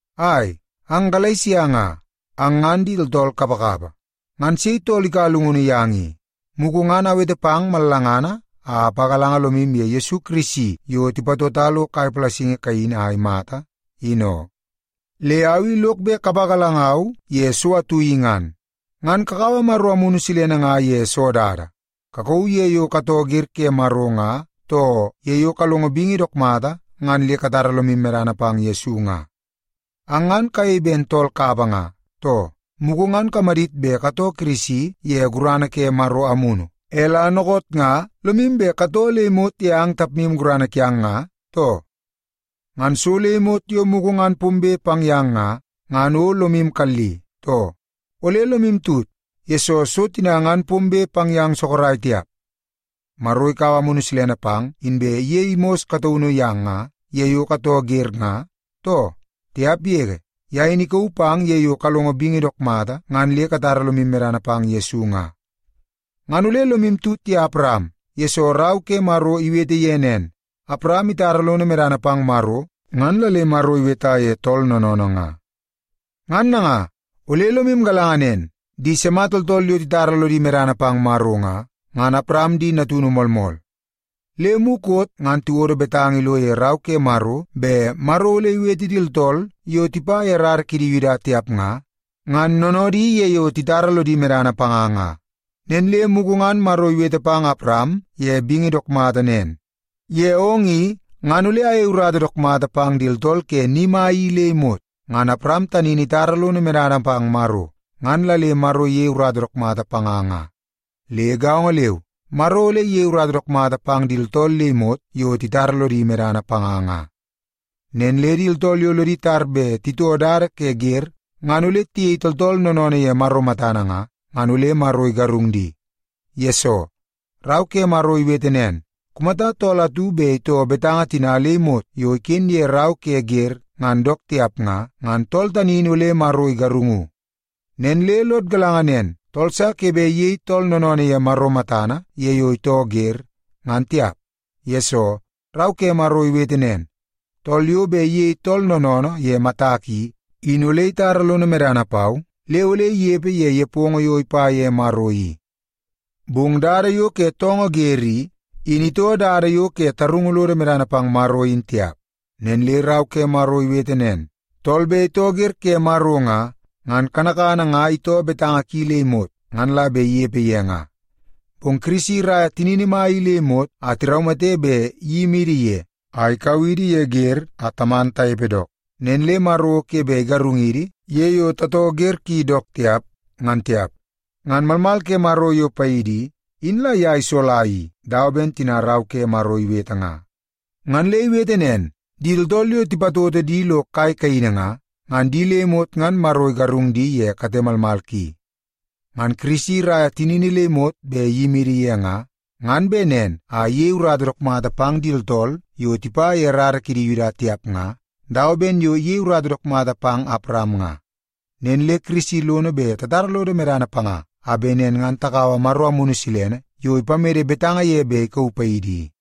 Ai, ang Galesia nga, ang ngan di tooltool kapakapa! Ngan sei tool ikaua llungunu yang i? Mugu ngan awete pang mallangana a apagalanga lomu ye Yesu Kirisi yo tipatota lo kai palasingi kaini a imata, in oo. Le au i lok bet kapagalangau ye so atu i ngan. Ngan kakaua Maro Amunu Silene nga ye soo dada? Kakauu ye yo katoo wer ke Maro nga, too ye yo kalongo bingi dook mata ngan le katara lomu medana pang Yesu nga? Ang ngan kayei ben tool kapa nga, too? Mugu ngan kamadit bet katoo Kirisi ye gurana ke Maro Amunu, e la dookoot nga lomu bet katoo le imot ye ang tapmu gurana kiang nga, too? Ngan so le imot yo mugu ngan pombe pang yang nga, ngan o lomu kalli, too? Ole lomu tut, yesoo so tina ngan pombe pang yang sorok tiap. Maro ikaua Amunu Silene pang, inbe iyei mos kataunu yang nga, ye yo katoo wer nga, too? Tiap yege! Ye in ikauu pang ye yo kalongo bingi dook mata ngan le katara lomu medana pang Yesu nga. Ngan ole lomu tut ye Awaram, yesoo Rau ke Maro iwete ye nen, “Awaram itara lono medana pang Maro, ngan la le Maro iweta ye tool noonoonoo nga.” Ngan nanga, ole lomu galanga nen, di sima tooltool yo titara lodi medana pang Maro nga, ngan Awaram di natunu moolmool. Le mukot ngan tiwodo betanga ilo ye Rau ke Maro bet Maro ole iwete di tooltool yo tipa ye rara kidi Yuda tiap nga, ngan noonoodi ye yo titara lodi medana panga nga. Nen le mugu ngan Maro iwete pang Awaram ye bingi dook mata nen, “Ye ong i, ngan ole ayei urata dook mata pang di tooltool ke ni mai i le imot nga.” Ngan Awaram tani in itara lono medana pang Maro, ngan la le Maro iyei urata dook mata panga nga. Le gaongo leu, Maro ole iyei urata dook mata pang di tooltool le imot yo titara lodi medana panga nga. Nen le di tooltool yo lodi tar bet titoo dada ke wer ngan ole tiyei tooltool noonoonoo ye Maro matana nga, ngan ole Maro igarung di. Yesoo, Rau ke Maro iwete nen, “Kumata tool atu bet itoo betanga tina le imot yo iken ye Rau ke Wer ngan dook tiap nga, ngan tool tani in ole Maro igarungu.” Nen le lod galanga nen, tool sa ke bet iyei tool noonoonoo ye Maro matana ye yo itoo wer, ngan tiap. Yesoo, Rau ke Maro iwete nen, “Tool yo bet iyei tool noonoonoo ye matak i, in ole itara lono medana pau le ole inepe ye nepongo yo ipa ye Maro i.” Bong dada yo ke toongoo wer i, in itoo dada yo ke tarungu lodo medana pang Maro in tiap. Nen le Rau ke Maro iwete nen, “Tool bet itoo wer ke Maro nga, ngan kanakana nga itoo betanga ki le imot ngan la bet inepe ye nga.” Bong Kirisi iraia tinini mai i le imot a tiraumate bet iyimidi ye a ikau idi ye wer a taman tanepe dook. Nen le Maro o ke bet igarungidi ye yo tatoo wer ki dook tiap, ngan tiap. Ngan malmal ke Maro yo paidi i, in la ye isola i dawa ben tina Rau ke Maro iwete nga. Ngan le iwete nen, “Di tooltool yo tipatoto di lo kai kaini nga, ngan di le imot ngan Maro igarung di ye kate malmal ki.” Ngan Kirisi iraia tinini le imot bet iyimidi ye nga, ngan bet nen a iyei urata dook mata pang di tooltool yo tipa ye rara kidi Yuda tiap nga, dawa ben yo iyei urata dook mata pang Awaram nga. Nen le Kirisi lono bet tatara lodo medana panga a bet nen ngan takaua Maro Amunu Silene yo ipamede betanga ye bet ikauu paidi i.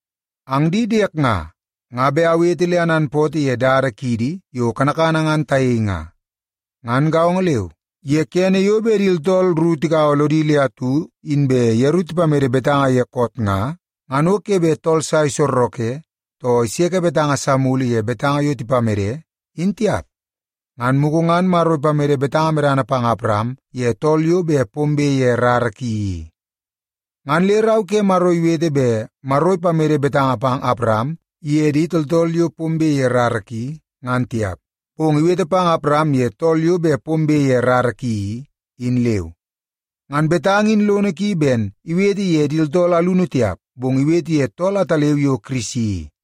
Ang di diek nga, nga bet awete le ananpootoo ye dada kiidi yo kanakana ngan tayei nga. Ngan gaongo leu, ye kene yo bet di tooltool ru tigaua lodi le atu inbe yeru tipamede betanga ye koot nga, ngan o ke bet tool sa isorreke, too iseke betanga sa mulu ye betanga yo tipamede, in tiap. Ngan mugu ngan Maro ipamede betanga medana pang Awaram ye tool yo bet pombe ye rara ki i. Ngan le Rau ke Maro iwete bet Maro ipamede betanga pang Awaram ye di tooltool yo bet pombe ye rara ki, ngan tiap, bong iwete, “pang Awaram ye tool yo bet pombe ye rara ki i,” in leu. Ngan betanga in lono ki ben iwete ye di tooltool alunu tiap, bong iwete ye tool ataleu yo Kirisi i.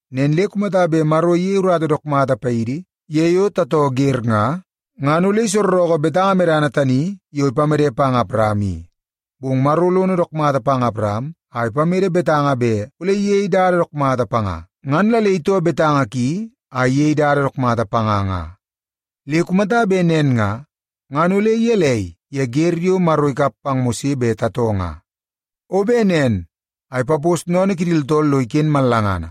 Nen le kumata bet Maro iyei urata dook mata paidi ye yo tatoo wer nga, ngan ole isorreke betanga medana tani yo ipamede pang Awaram i. Bong Maro lono dook mata pang Awaram a ipamede betanga bet ole iyei dada dook mata panga, ngan la le itoo betanga ki a iyei dada dook mata panga nga. Le kumata bet nen nga, ngan ole gelei ye wer yo Maro ikap pang Mose bet tatoo nga? O bet nen a ipapos sennene kidi tooltool lo iken mallangana.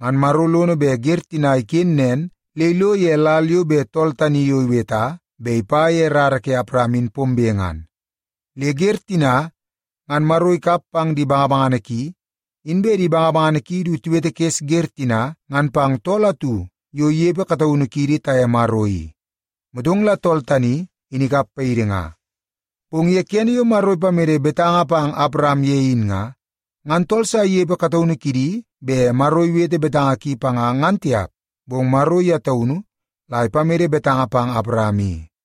Ngan Maro lono bet wer tina iken nen le ilo ye lal yo bet tool tani yo iweta bet ipa ye rara ke Awaram in pombe ngan. Le wer tina ngan Maro ikap pang di bangabangana ki, inbe di bangabangana ki du tiwetekes wer tina ngan pang tool atu yo inepe kataunu kiidi taye Maro i. Motong la tool tani, in ikap paidi nga. Bong ye kene yo Maro ipamede betanga pang Awaram ye in nga, ngan tool sa inepe kataunu kidi bet Maro iwete betanga ki panga ngan tiap. Bong Maro ye taunu la ipamede betanga pang Awaram i.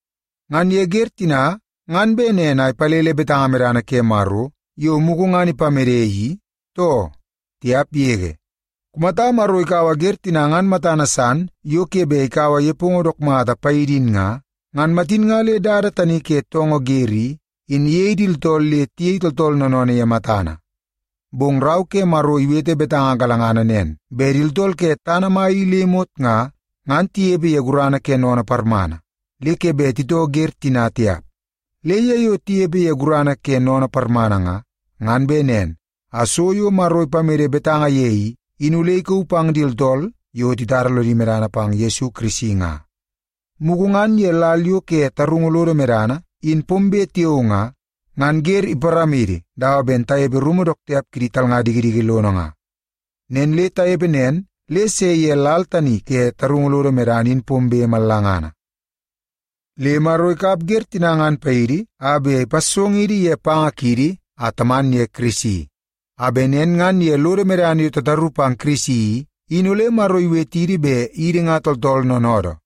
Ngan ye wer tina ngan bet nen a ipalele betanga medana ke Maro yo mugu ngan ipamede i too? Tiap yege! Kumata Maro ikaua wer tina ngan matana san yo ke bet ikaua nepongo dook mata paidi in nga, ngan matin nga le dada tani ke toongoo wer i, in iyei idi le tayei tooltool noonoonoo ye matana. Bong Rau ke Maro iwete betanga galangana nen bet di tooltool ke tana mai i le imot nga, ngan tinepe ye gurana ke sennene parmana, le ke bet titoo wer tina tiap. Le ye yo tinepe ye gurana ke sennene parmana nga, ngan bet nen a so yo Maro ipamede betanga ye i, in ole ikauu pang di tooltool yo titara lodi medana pang Yesu Kirisi nga. Mugu ngan ye lal yo ke tarungu lodo medana in pombe tiao nga, ngan wer iparamidi dawa ben tanepe rumu dook tiap kidi talnga dikidiki lono nga. Ngan le tanepe nen le tase ye lal tani ke tarungu lodo medana in pombe mallangana. Le Maro ikap wer tina ngan paidi a bet ipassongidi ye panga kiidi a taman ye Kirisi. A bet nen ngan ye lodo medana yo tataru pang Kirisi i, in ole Maro iwetidi bet idi nga tooltool noonoodoo.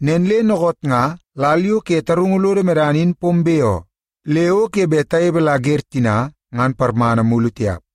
Nen le dookoot nga lal yo ke tarungu lodo medana in pombe oo. Le o ke bet tanepe la wer tina ngan parmana mulu tiap.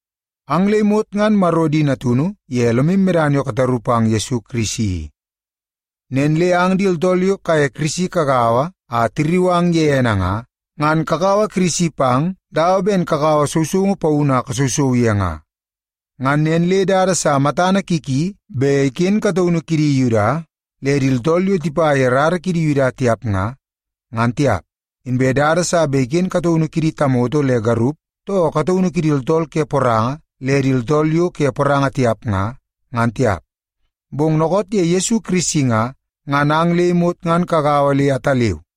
Ang le imot ngan Maro di natunu ye lomu medana yo kataru pang Yesu Kirisi i. Nen le ang di tooltool yo kaye Kirisi kagaua a tirriu ang ye ene nga, ngan kakaua Kirisi pang dawa ben kakaua sousoungu paunu a kasousou ye nga. Ngan nen le dada sa matana ki ki bet iken kataunu kidi Yuda le di tooltool yo tipa ye rara kidi Yuda tiap nga, ngan tiap. Inbe dada sa ke bet iken kataunu kidi tamoto le garup, too kataunu kidi tooltool ke poranga le di tooltool yo ke poranga tiap nga, ngan tiap. Bong dookoot ye Yesu Kirisi nga, ngan ang le imot ngan kagaua le ataleu.